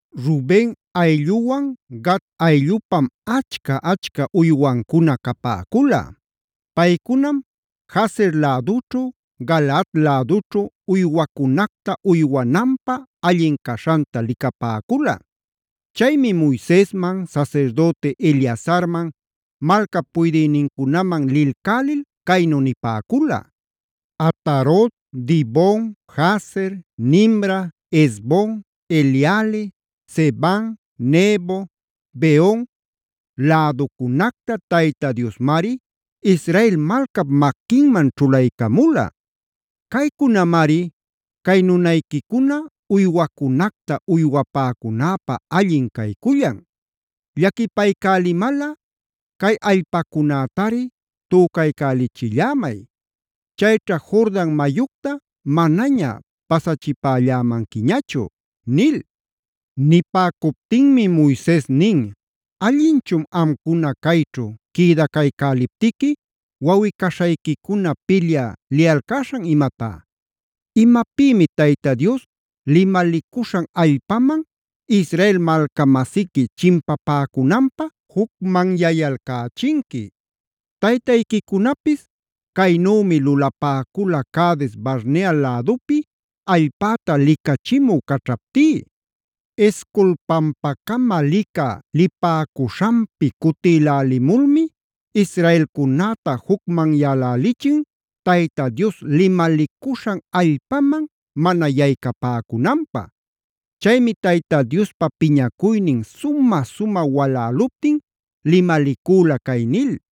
Ruben aylluwan Gad ayllupam achca-achca uywancuna capäcula. Paycunam Jazer lädućhu, Galaad lädućhu uywacunacta uywananpä allin caśhanta licapäcula. Chaymi Moisesman, sasirdüti Eleazarman, malcap puydïnincunaman lilcälil caynu nipäcula: “Atarot, Dibon, Jazer, Nimra, Hesbon, Eleale, Sebam, Nebo, Beon, läducunacta Tayta Diosmari Israel malcap maquinman ćhulaycamula. Caycunamari cay nunayquicuna uywacunacta uywapäcunäpä allin caycullan. Llaquipaycälimalꞌa cay allpacunätari tücaycälichillämay; chayćha Jordan mayucta manaña pasachipällämanquichu” nil. Nipäcuptinmi Moises nin: “¿Allinchun amcuna cayćhu quïdacaycäliptiqui wawꞌi-caśhayquicuna pilyä liyalcäśhan imatá? ¿Imapïmi Tayta Dios limalicuśhan allpaman Israel malca-masiqui chimpapäcünanpä jucmanyayalcächinqui? Taytayquicunapis caynümi lulapäcula Cades-barnea lädupi allpäta licachimü caćhaptí. Escol pampacama licä lipäcuśhanpi cutilälimulmi israelcunäta jucmanyälälichin Tayta Dios limalicuśhan allpaman mana yaycapäcunanpä.a Chaymi Tayta Diospa piñacuynin sumä-sumä waläluptin limalicüla cay nil: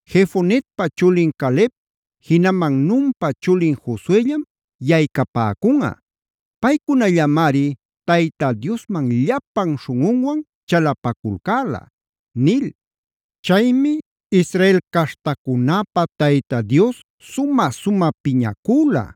Jefonep chulin Caleb, jinaman Nunpa chulin Josuellam yaycapäcunꞌa; paycunallamari Tayta Diosman llapan śhunꞌunwan chalapaculcäla’ nil. Chaymi Israel caśhtacunäpä Tayta Dios sumä-sumä piñacüla.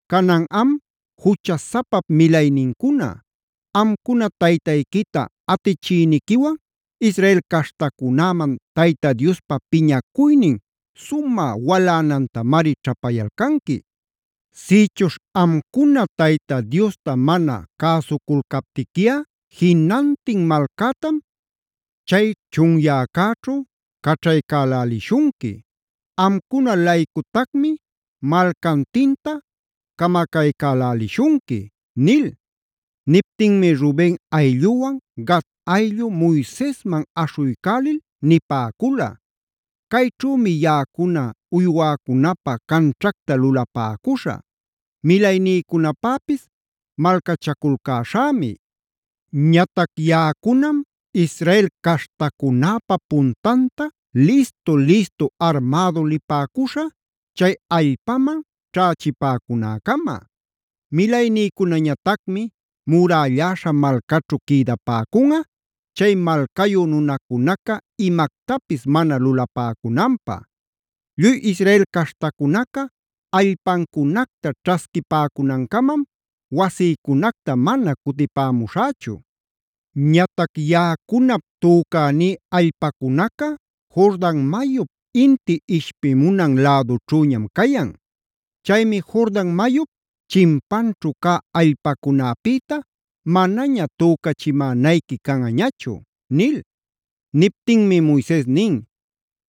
Canan am ¡juchasapap milaynincuna! Amcuna taytayquita atichïniquiwan Israel caśhtacunäman Tayta Diospa piñacuynin sumä walanantamari ćhapayalcanqui. Sïchuśh amcuna Tayta Diosta mana cäsuculcaptiquiꞌa jinantin malcätam chay chunyäcäćhu caćhaycälälishunqui. Amcuna-laycutacmi malcantinta camacaycälälishunqui” nil. Niptinmi Ruben aylluwan Gad ayllu Moisesman aśhuycälil nipäcula: “Cayćhümi yaꞌacuna uywäcunapä canćhacta lulapäcuśhä; milaynïcunapäpis malcachaculcäśhämi. Ñatac yaꞌacunam Israel caśhtacunäpa puntanta listu-listu armädu lipäcuśhä, chay allpaman ćhächipäcunäcama. Milaynïcunañatacmi murälläśha malcaćhu quïdapäcunꞌa, chay malcayü nunacunaca imactapis mana lulapäcunanpä. Lluy Israel caśhtacunaca allpancunacta ćhasquipäcunancamam wasïcunacta mana cutipämuśhächu. Ñatac yaꞌacunap tücaní allpacunaca Jordan mayup inti ishpimunan lädućhüñam cayan. Chaymi Jordan mayup chimpanćhu cä allpacunäpïta manaña tücachimänayqui canꞌañachu” nil. Niptinmi Moises nin: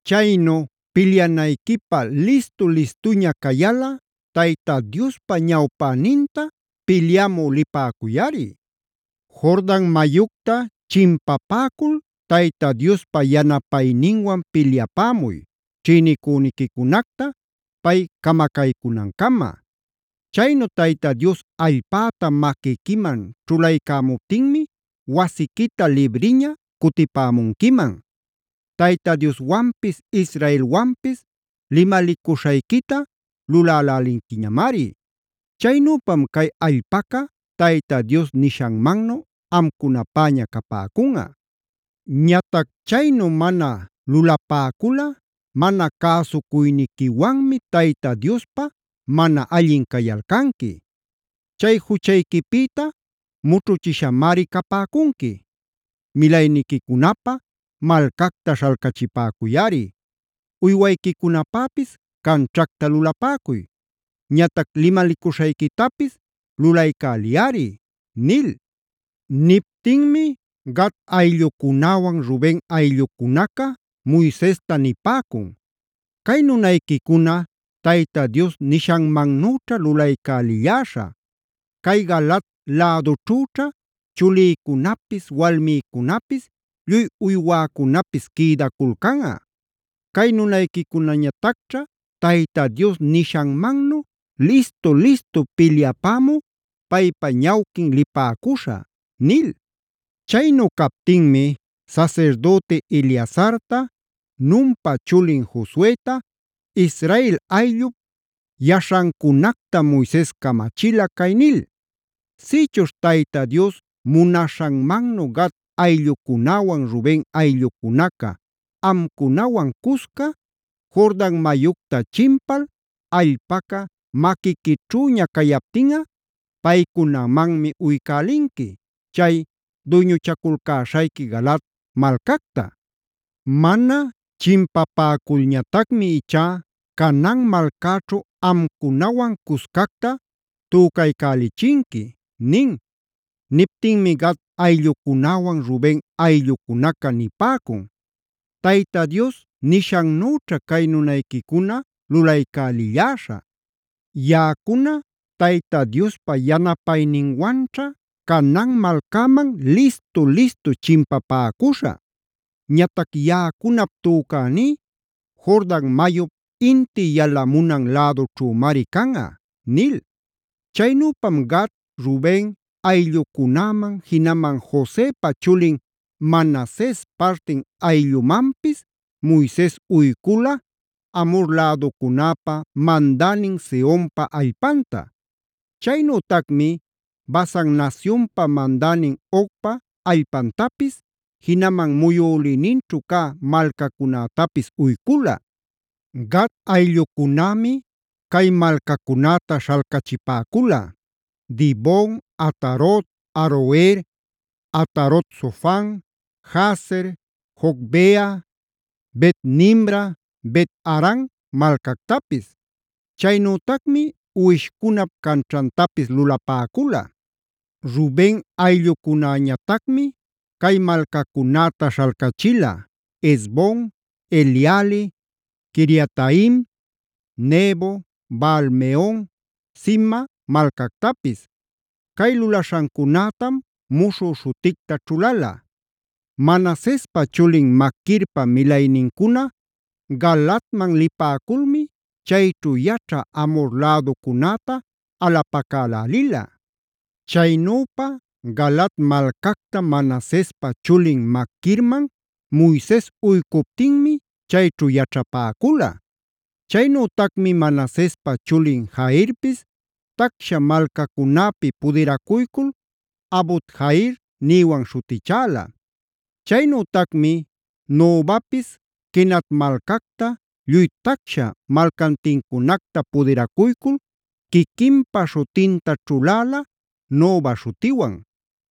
“Chaynu pilyanayquipä listu-listuña cayalꞌa Tayta Diospa ñawpäninta pilyapämu lipäcuyꞌari. Jordan mayucta chimpapäcul Tayta Diospa yanapayninwan pilyapämuy, ćhïnicüniquicunacta pay camacaycunancama. Chaynu Tayta Dios allpäta maquiquiman ćhulaycämuptinmi wasiquita libriña cutipämunquiman. Tayta Dioswanpis israelwanpis limalicuśhayquita lulälälinquiñamari. Chaynüpam cay allpaca Tayta Dios nishanmannu amcunapäña capäcunꞌa. Ñatac chaynu mana luläpäculꞌa mana cäsucuyniquiwanmi Tayta Diospä mana allin cayalcanqui. Chay juchayquipïta mućhuchishamari capäcunqui. Milayniquicunapä malcacta śhalcachipäcuyꞌari, uywayquicunapäpis canćhacta lulapäcuy. Ñatac limalicuśhayquitapis lulaycäliyꞌari” nil. Niptinmi Gad ayllucunäwan Ruben ayllucunaca Moisesta nipäcun: “Cay nunayquicuna Tayta Dios nishanmannüćha lulaycälilläśhä. Cay Galaad lädućhüćha chulïcunapis, walmïcunapis lluy uywäcunapis quïdaculcanꞌa. Cay nunayquicunañatacćha Tayta Dios nishanmannu listu-listu pilyapämü paypa ñawquin lipäcuśhä” nil. Chaynu captinmi sasirdüti Eleazarta Nunpa chulin Josueta, Israel ayllup yaśhancunacta Moises camachila, cay nil: “Sïchuśh Tayta Dios munaśhanmannu Gad ayllucunäwan Ruben ayllucunaca amcunawan cusca, Jordan mayucta chimpal allpaca maquiquićhüña cayaptinꞌa, paycunamanmi uycälinqui, chay duyñuchaculcäśhayqui Galaad malcacta. Mana chimpapäculñatacmi ichá Canaan malcäćhu amcunawan cuscacta tücaycälishunqui” nin. Niptinmi Gad ayllucunäwan Ruben ayllucunaca nipäcun: “Tayta Dios nishannüćha cay nunayquicuna lulaycälilläśhä. Yaꞌacuna Tayta Diospa yanapayninwanćha Canaan malcäman listu-listu chimpapäcuśhä. Ñatac yaꞌacunap tücäní Jordan mayup inti yalamunan lädućhümari canꞌa”c nil. Chaynüpam Gad, Ruben ayllucunäman, jinaman Josepa chulin Manases partin ayllumanpis Moises uycula Amhor läducunäpa mandänin Sehonpa allpanta. Chaynütacmi Basan nasyunpa mandänin Ogpa allpantapis, jinaman muyülïninćhu cä malcacunätapis uycula. Gad ayllucunämi cay malcacunäta śhalcachipäcula: Dibon, Atarot, Aroer, Atarot-sofan, Jazer, Jogbeha, Bet-nimra, Bet-aran malcactapis. Chaynütacmi uwishcunap canćhantapis lulapäcula. Ruben ayllucunañatacmi cay malcacunäta śhalcachila: Hesbon, Eleale, Quiriataim, Nebo, Baal-meon, Sibma malcactapis. Cay lulaśhancunätam muśhü śhuticta ćhulala. Manasespa chulin Maquirpa milaynincuna Galaadman lipäculmi chayćhu yaćhä Amhor läducunäta alapacälälila. Chaynüpa Galaad malcacta Manasespa chulin Maquirman Moises uycuptinmi chayćhu yaćhapäcula. Chaynütacmi Manasespa chulin Jairpis tacsha malcacunäpi pudiracuycul Havot-jair nïwan śhutichäla. Chaynütacmi Nobapis Kenat malcacta, lluy tacsha malcantincunacta pudiracuycul quiquinpa śhutinta ćhuläla, Noba śhutiwan.